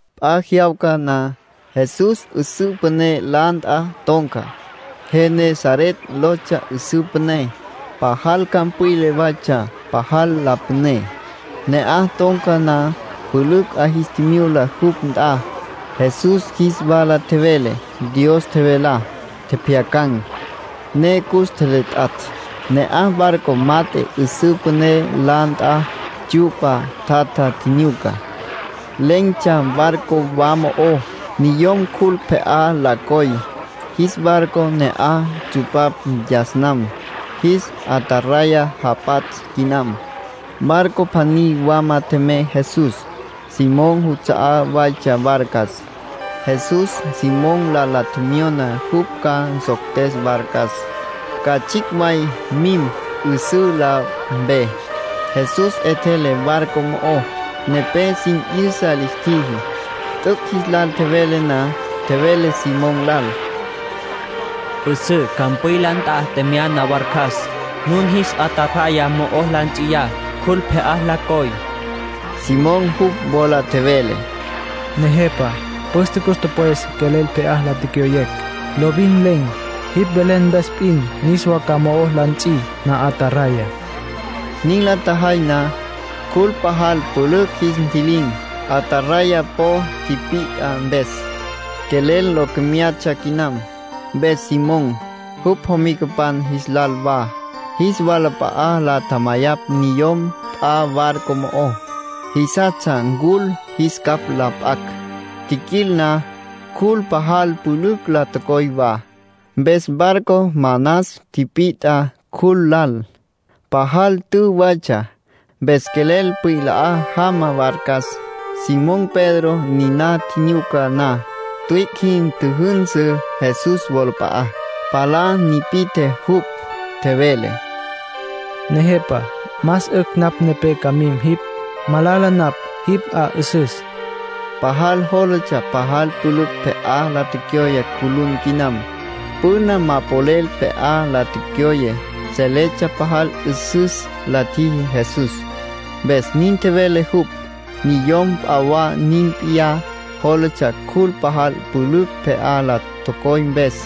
P'a jyawca na, Jesús 'üsǘ püné la nt'a ton̈ca. Genesaret lotsja 'üsǘ püné. (Pajal campwila waytsja, pajal la püné.) Ne'aj ton̈ca na, pülücj 'a jis tjimyula jupj nt'a. Jesús jis wala tjevele Dios tjevelá. Tjepjyacan̈, ne cus tjeletjatj. Ne'aj barco mat'e 'üsǘ püné la nt'a tsyu'pa tjatja tjinyuca. Len̈tsja barco wa mo'ó. Niyom cjul pje'á la coy, jis barco ne'aj tsupapj yas nam. Jis ataraya japatsj quinam. Barco pjaní wama tjemey Jesús. Simón juts'a'á waytsja barcas. Jesús Simón lal la tjemyona jupj ca nsoctes barcas, ca tsjicj way mim 'üsǘ la mpe. Jesús 'etjele barco mo'ó, nepé sin 'yüsa lis tjiji. T'üc' jis lal tjevele na, tjevele Simón lal: —'Üsǘ campwila nt'a tjemyana barcas. Nun jis ataraya mo'o la ts'iyá, cjul pje'á la coy. Simón jupj wola tjevele: —Nejepa, püste cus tüpwes quelel pje'á la tecyoyecj; lovin len̈. Jipj velen mpes p'in niswa ca mo'o la nts'i na'ataraya. Nin la tjajay na, cjul pajal pülücj jis ntji'lin̈. Ataraya po tipit'a mpes, quelel lo comyatsja quinam. Mpes Simón, jupj jomicapan jis lal wa, jis walap'a'a la tjamayapj niyom p'a barco mo'ó. Jisastsja ncul jis capj la p'acj. Tjiquil na, cjul pajal pülücj la tocoy wa, mpes barco manas tipit'a cjul lal. Pajal tü waytsja, mpes quelel pwila jama barcas. Simón Pedro niná tjinyuca na, tüic' jin tjüjünsü Jesús wolap'a'á. Palá nipi'tje jupj. Tjevele: —Nejepa, más 'ücj napj nepé ca mim jipj. Malala napj, jipj 'a 'üsüs. Pajal jólatsja pajal pülücj pje'á la tecyoye cjulun quinam. Püna ma polel pje'á la tecyoye. Seletsja pajal 'üsüs la tjiji Jesús, mpes nin tjevele jupj. Niyom p'a wa nin p'iyá yólatsja cjul pajal pülücj pje'á la tocoy mpes.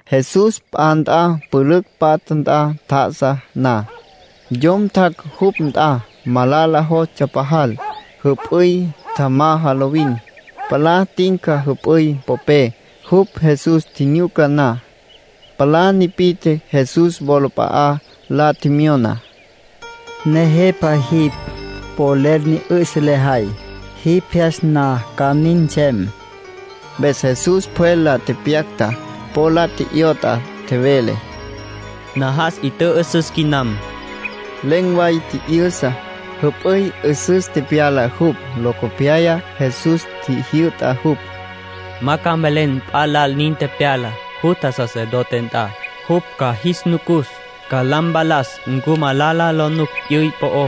Jesús p'a nt'a pülücj patja nt'a tjá'asa na, yom tjac' jupj nt'a. Malala jostsja pajal. Jüp'üy tjamaja lovin, palá tinca jüp'üy popé. Jupj Jesús tjinyuca na, palá nipi'tje Jesús wolap'a'á. La tjemyona: —Nejepa, jipj polel ni 'ü'sa lejay. Jipj jyas na ca nin nsem. Mpes Jesús pjwel la tepyacta, po la tje'yot'a. Tjevele: —Najas. 'I tjü'ü'süs quinam. Len̈ way tji'yü'sa, jüp'üy 'üsüs tepyala jupj. Locopyaya Jesús tjijyü'ta jupj: —Ma ca mvelen p'a lal nin tepyalá. Jutja sacerdote nt'a. Jupj ca jis nucus. Ca la mpalas ncu malala lo nuc p'yüy po'ó.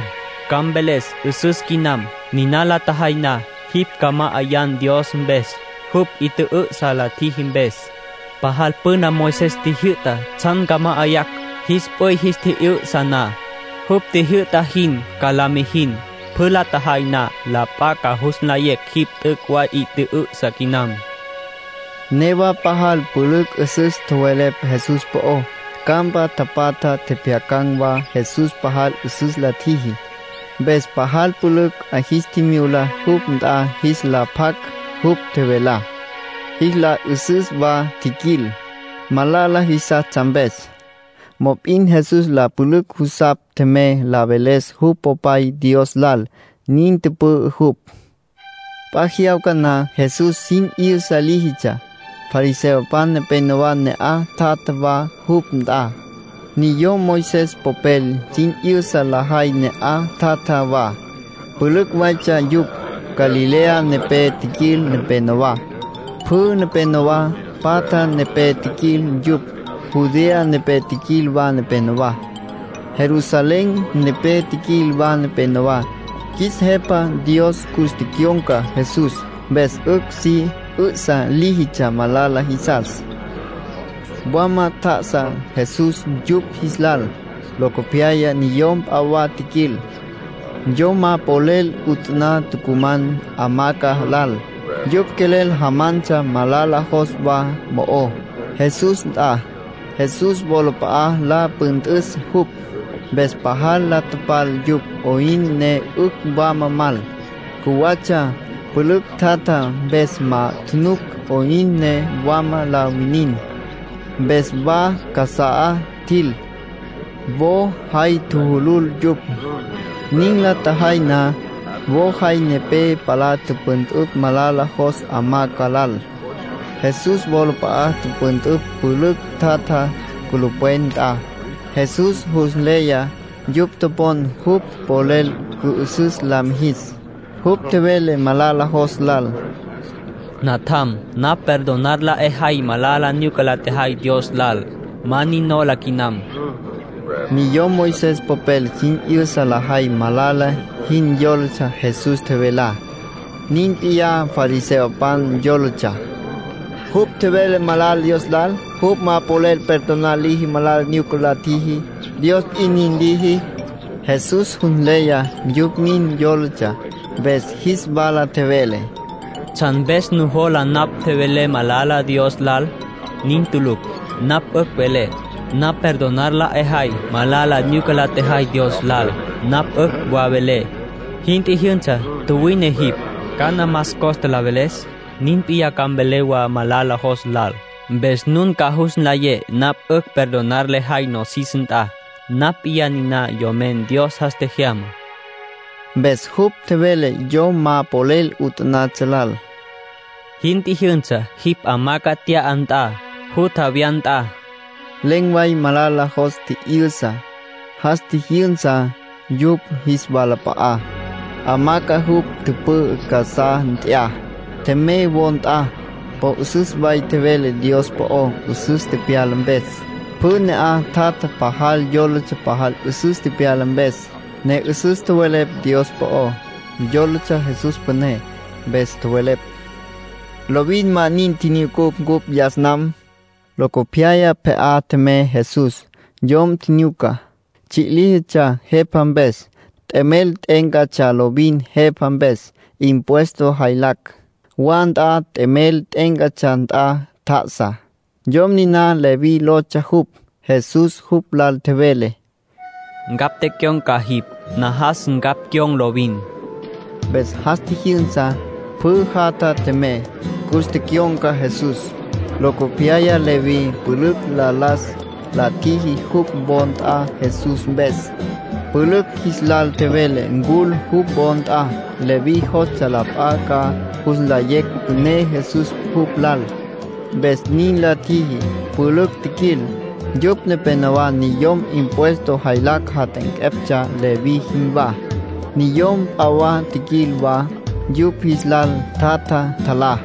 Ca mveles 'üsüs quinam. Niná la tjejay na, jipj ca ma'ayan Dios mpes, jupj 'i tjü'ü'sa la tjiji mpes. Pajal püna Moisés tjijyü'ta tsjan ca ma'ayacj, jis p'üy jis tji'yü'sa na. Jupj tjijyü'ta jin ca la mijin. Pjü la tjejay na, la p'a ca jus nlayecj jipj t'üc' way 'i tjü'ü'sa quinam —tjevele Jesús. Newa pajal pülücj 'üsüs tjowelepj Jesús po'ó. Campa tapatja tjepjyacan̈ wa Jesús pajal 'üsüs la tjiji. Mpes pajal pülücj 'a jis tjimyula jupj nt'a jis la pjac jupj tjevelá, jis la 'ü'süs wa tjiquil, malala jisastsja mpes. Mop'in Jesús la pülücj jusapj tjemey la veles jupj Popay Dios lal. Nin tüpü'ü jupj. P'a jyawca na Jesús sin 'yüsa líjitsja. Fariseopan nepénowa ne'aj tjatja wa jupj nt'a. Niyom Moisés popel sin 'yüsa lajay ne'aj tjatja wa. Pülücj waytsja yupj. Galilea nepé tjiquil nepenowá. Pjü nepénowa patja mpe tjiquil yupj. Judea nepé tjiquil wa nepenowá. Jerusalén nepé tjiquil wa nepenowá. Qjuis Jepa Dios cus tecyon̈ca Jesús, mpes 'ücj si 'ü'sa líjitsja malala jisas. Wama tjá'asa Jesús yupj jis lal. Locopyaya niyom p'a wa tjiquil, yom ma polel 'utaná tucuman hamaca lal. Yupj quelel jamantsja malala jos wa mo'ó, Jesús nt'a, Jesús wolap'a'a la püntüs jupj. Mpes pajal la tapal yupj 'oyn ne 'ücj wama mal. Cjuwatsja. Pülücj tjatja mpes ma tjunuc 'oyn ne wama la winin. Mpes wa casa'á tjil, wo jay tjujulul yupj. Nin la tjajay na, wo jay nepé palá tüpüntüpj malala jos hamaca lal. Jesús wolap'a'a tüpüntüpj pülücj tjatja culupwen nt'a. Jesús jus nleya yupj topon jupj polel cü'ü'süs la mijis. Jupj tjevele malala jos lal: —Natjam, napj perdonar la 'ejay malala nyuca la tjejay Dios lal. Ma nin nola quinam. Niyom Moisés popel sin 'yüsa lajay malala jin yólatsja Jesús tjevelá. Nin p'iyá fariseopan. Yólatsja: “Jupj tjevelá malala Dios lal. Jupj ma polel perdonar liji malala nyuca la tjiji. Dios p'in nin liji.” Jesús jus nleya yupj nin yólatsja, mpes jis wala tjevele: —¿Tsjan mpes nujola napj tjevelé malala Dios lal? Nin tulucj. Napj 'ücj velé: ‘Napj perdonar la 'ejay malala nyuca la tjejay Dios lal’. Napj 'ücj wa velé: ‘Jin tjijyünsa, tjuwine jipj’. ¿Cana más costa la veles? Nin p'iyá ca mvelé wa malala jos lal, mpes nun ca jus nlayé napj 'ücj perdonar lejay nosis nt'a. Napj p'iyá niná Yomen Dios jas tjejyamá —nin tjevele Jesús. Mpes jupj tjevele yom ma polel 'utanatsja lal: —Jin tjijyünsa, jipj hamaca nt'ya nt'an, jutja wya nt'a. Len̈ way malala jos tji'yü'sa. Jas tjijyünsa yupj jis walap'a'á, hamaca jupj tüpü'ü casá nt'ya, tjemey wo nt'a. Po 'üsüs way tjevele Dios po'ó, 'üsüs tepyala mpes. Pjü ne'aj tjatja pajal yólatsja pajal 'üsüs tepyala mpes, ne 'üsüs tjowelepj Dios po'ó. Yólatsja Jesús püné. Mpes tjowelepj: “Lovin ma nin tjinyucucj cupj yas nam”. Locopyaya pje'á tjemey Jesús. Yom tjinyuca, tsji' líjitsja jepa mpes. T'emel t'e'éncatsja lovin jepa mpes, impuesto jaylacj. Wa nt'a t'emel t'e'éncatsja nt'a tjá'asa. Yom niná Leví lotsja jupj. Jesús jupj lal tjevele: —Ncapj tecyon̈ca jipj. Najas ncapj cyon̈ lovin. Mpes jas tjijyünsa, pjü jatja tjemey. Cus tecyon̈ca Jesús. Locopyaya Leví pülücj la las la tjiji jupj wo nt'a Jesús mpes. Pülücj jis lal tjevele ncul jupj wo nt'a. Leví jostsja la p'a ca jus nlayecj püné Jesús jupj lal, mpes nin la tjiji. Pülücj tjiquil, yupj nepénowa niyom impuesto jaylacj jat'anqueptsja, Leví jinwá. Niyom p'a wa tjiquil wa. Yupj jis lal tjatja, tjalá.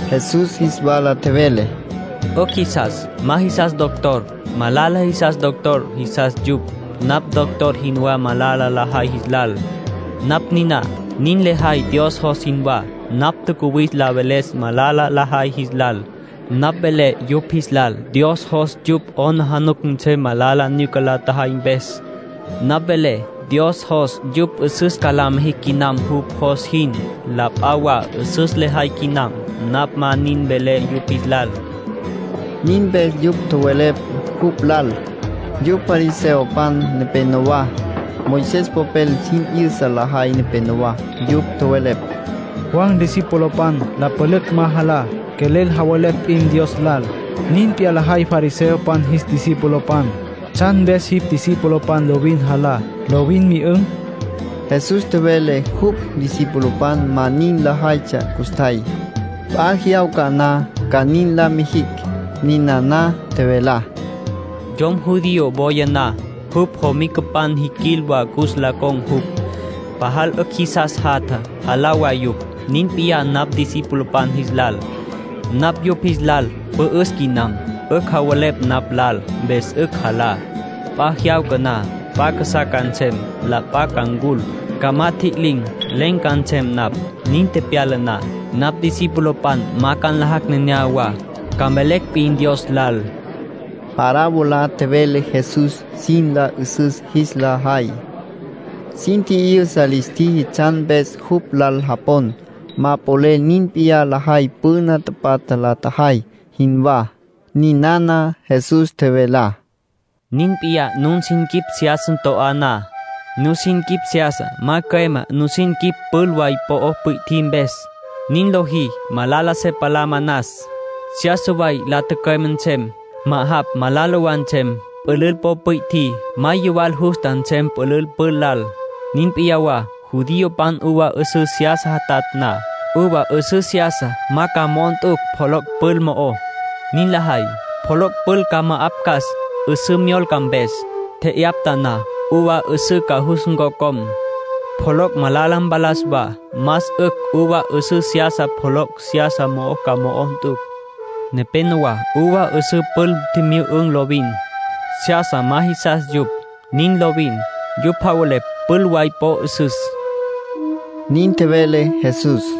Jesús jis wala tjevele: —'Ücj jisas ma jisas doctor. Malala jisas doctor jisas yupj. Napj doctor jinwá malala lajay jis lal. Napj niná nin lejay Dios jos jinwá. Napj tjacuwis la veles malala lajay jis lal. Napj velé yupj jis lal Dios jos yupj 'aplijila nsem malala nyuca la tjajay mpes. Napj velé Dios jos yupj 'üsüs ca la mijicj quinam jupj jos jin. La p'a wa 'üsüs lajay quinam, napj ma nin velé yupj jis lal —nin tjevele Jesús. Nin mpes yupj tjowelepj jupj lal, yupj fariseopan nepenowá, Moisés popel sin 'yüsa lajay nepenowá. Yupj tjowelepj: —Juan discipulopan la pülücj ma jalá, quelel javelepj p'in Dios lal. Nin p'iyá lajay fariseopan jis discipulopan. ¿Tsjan mpes jipj discipulopan lovin jalá, lovin myü'ün̈? Jesús tjevele jupj discipulopan ma nin lajaytsja custjay. P'a jyawca na ca nin la mijicj. Ninana tjevelá: —Yom judío woya na, jupj jomicapan jiquil wa cus la con̈ jupj. Pajal 'ücj jisas jatja, jalá wa yupj. Nin p'iyá napj discipulopan jis lal. Napj yupj jis lal pü'üs quinam. 'Ücj javelepj napj lal, mpes 'ücj jalá. P'a jyawca na, p'a casá ca nsem. La p'a ca ncul, ca ma tjililin̈. Len̈ ca nsem napj. Nin tepyala na, napj discipulopan ma ca nlajacj nenéyawa, ca mvelecj p'in Dios lal. Parábola tjevele Jesús sin la 'üsüs jis la jay. Sin tji'yüsa lis tjiji tsjan mpes jupj lal japon ma polel nin p'iyá lajay püna tapatja la tjajay jinwá. Ninana Jesús tjevelá: —Nin p'iyá nun nusin quip seyasa to'á na, nusin quip seyasa ma cüemá nusin quip pül way po pwi'tjí mpes. Nin lojí, malala se palá manas. Seyasa way la tücüeme nsem; ma'ajapj malala wa nsem. Pülül po pwi'tjí ma yuwal justa nsem pülül pül lal. Nin p'iyá wa judiopan uva 'üsǘ seyasa jatatj na. Uva 'üsǘ seyasa ma ca mo'o nt'ucj pjoloc' pül mo'ó. Nin lajay, pjoloc' pül ca ma'apcas 'üsǘ myolca mpes. Tje'yapta na, uva 'üsǘ ca jus ncocom. Pjoloc' malala mpalas wa. Más 'ücj uva 'üsǘ seyasa pjoloc' seyasa mo'ó ca mo'o nt'ucj. Nepénowa uva 'üsǘ pül tjimyü'ün̈ lovin. Seyasa ma jisas yupj. Nin lovin. Yupj javelepj pül way po 'üsüs —nin tjevele Jesús.